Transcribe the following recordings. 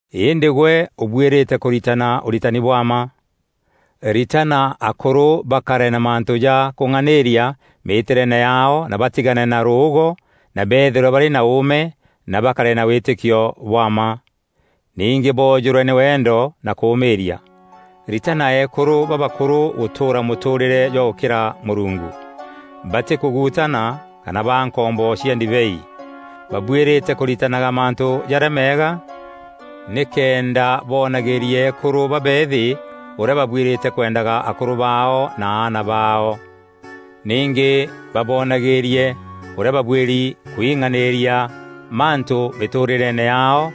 Îndî gwe ûbuîrîte kûritana ûritani bwa mma. Ritana akûrû bakare na mantû ja kûng'anîîria mîtîreene yaao na batigane na rûûgo na beethîrwe barî na ûûme na bakare na wîtîkio bwa mma. Ningî boojûrwe nî wendo na kûmîîria. Ritana eekûrû babakûrû gûtûûra mûtûûrîre jwa gûkîra Mûrungu. Batî kûguutana kana baa nkombo cia ndibei. Babuîrîte kûritanaga mantû jarîa meega nîkenda boonagîîrie eekûrû babeethî ûrîa babuîrîte kwendaga akûrû baao na aana baao. Ningî baboonagîîrie ûrîa babuîri kwîng'anîîria mantû mîtûûrîreene yaao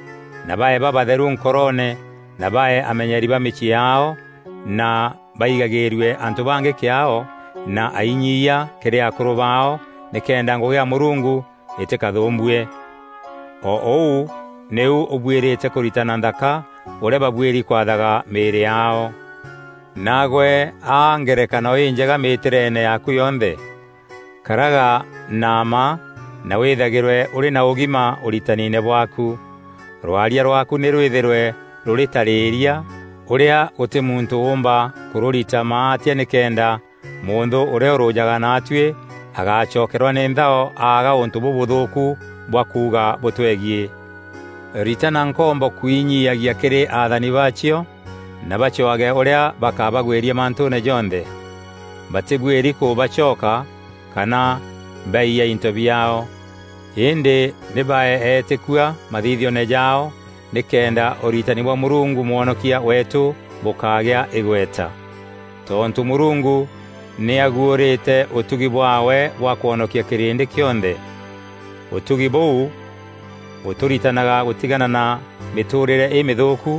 na bae babatheru nkoroone na bae amenyeeri ba mîciî yaao na baigagîîrue antû bangî kîaao na ainyiiya kîrî akûrû baao nîkenda ngûgî ya Mûrungu îtîkathûûmbue. O ûu nîu ûbuîrîte kûritana nthaka ûrîa babuîri kwathaga mîîrî yaao. Naagwe aa ngerekano înjega mîtîreene yaaku yonthe. Karaga na mma na wîthagîrwe ûrî na ûgima ûritanine bwaaku. Rwaria rwaaku nî rwîthîrwe rûrî tarîria ûrîa gûtî muntû ûûmba kûrûrita maatia nîkenda mûnthû ûrîa ûrûjaga naatuî agaacokerwa nî nthao aaga ûntû bûbûthûûku bwa kuuga bûtwegiî. Ritana nkombo kwinyiiagia kîrî athani baacio na bacwaage ûrîa bakabagwîria mantûûne jonthe. Batîbuîri kûbacoka kana baiya into biaao. Îndî nî bae eetîkua mathithioone jaao nîkenda ûritani bwa Mûrungu Mwonokia weetû bûkagîa îgweta. Tontû Mûrungu nî aguûrîte ûtugi bwaawe bwa kwonokia kîrîndî kîonthe. Ûtugi bûu bûtûritanaga gûtigana na mîtûrîre îmîthûûku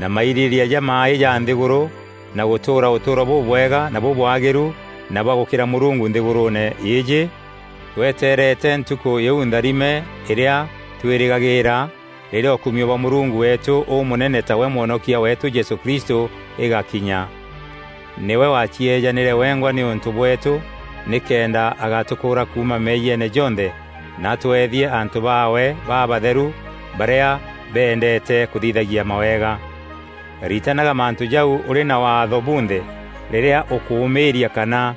na mairîrîîria jamaaî ja nthîgûrû na gûtûûra ûtûûro bûbwega na bûbwagîîru na bwa gûkîra Mûrungu nthîgûrûûne îîjî, tweteerete Ntukû îu ntharime îrîa twîrîgagîîra, rîrîa ûkumio bwa Mûrungu weetû Ûmûnene tawe Mwonokia weetû Jesû Kristû îgakinya. Nîwe wacieejanîre wengwa nîûntû bweetû nîkenda agatûkûra kuuma meeyiene jonthe na atweethie antû baawe babatheru barîa beendeete kûthithagia mawega. Ritanaga mantû jau ûrî na Waatho bunthe rîrîa ûkûmîîria kana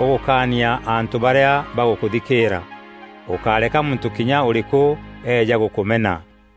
ûgûkaania antû barîa bagûkûthikîîra. Ûkáreka muntû kinya ûrîkû eeja gûkûmena.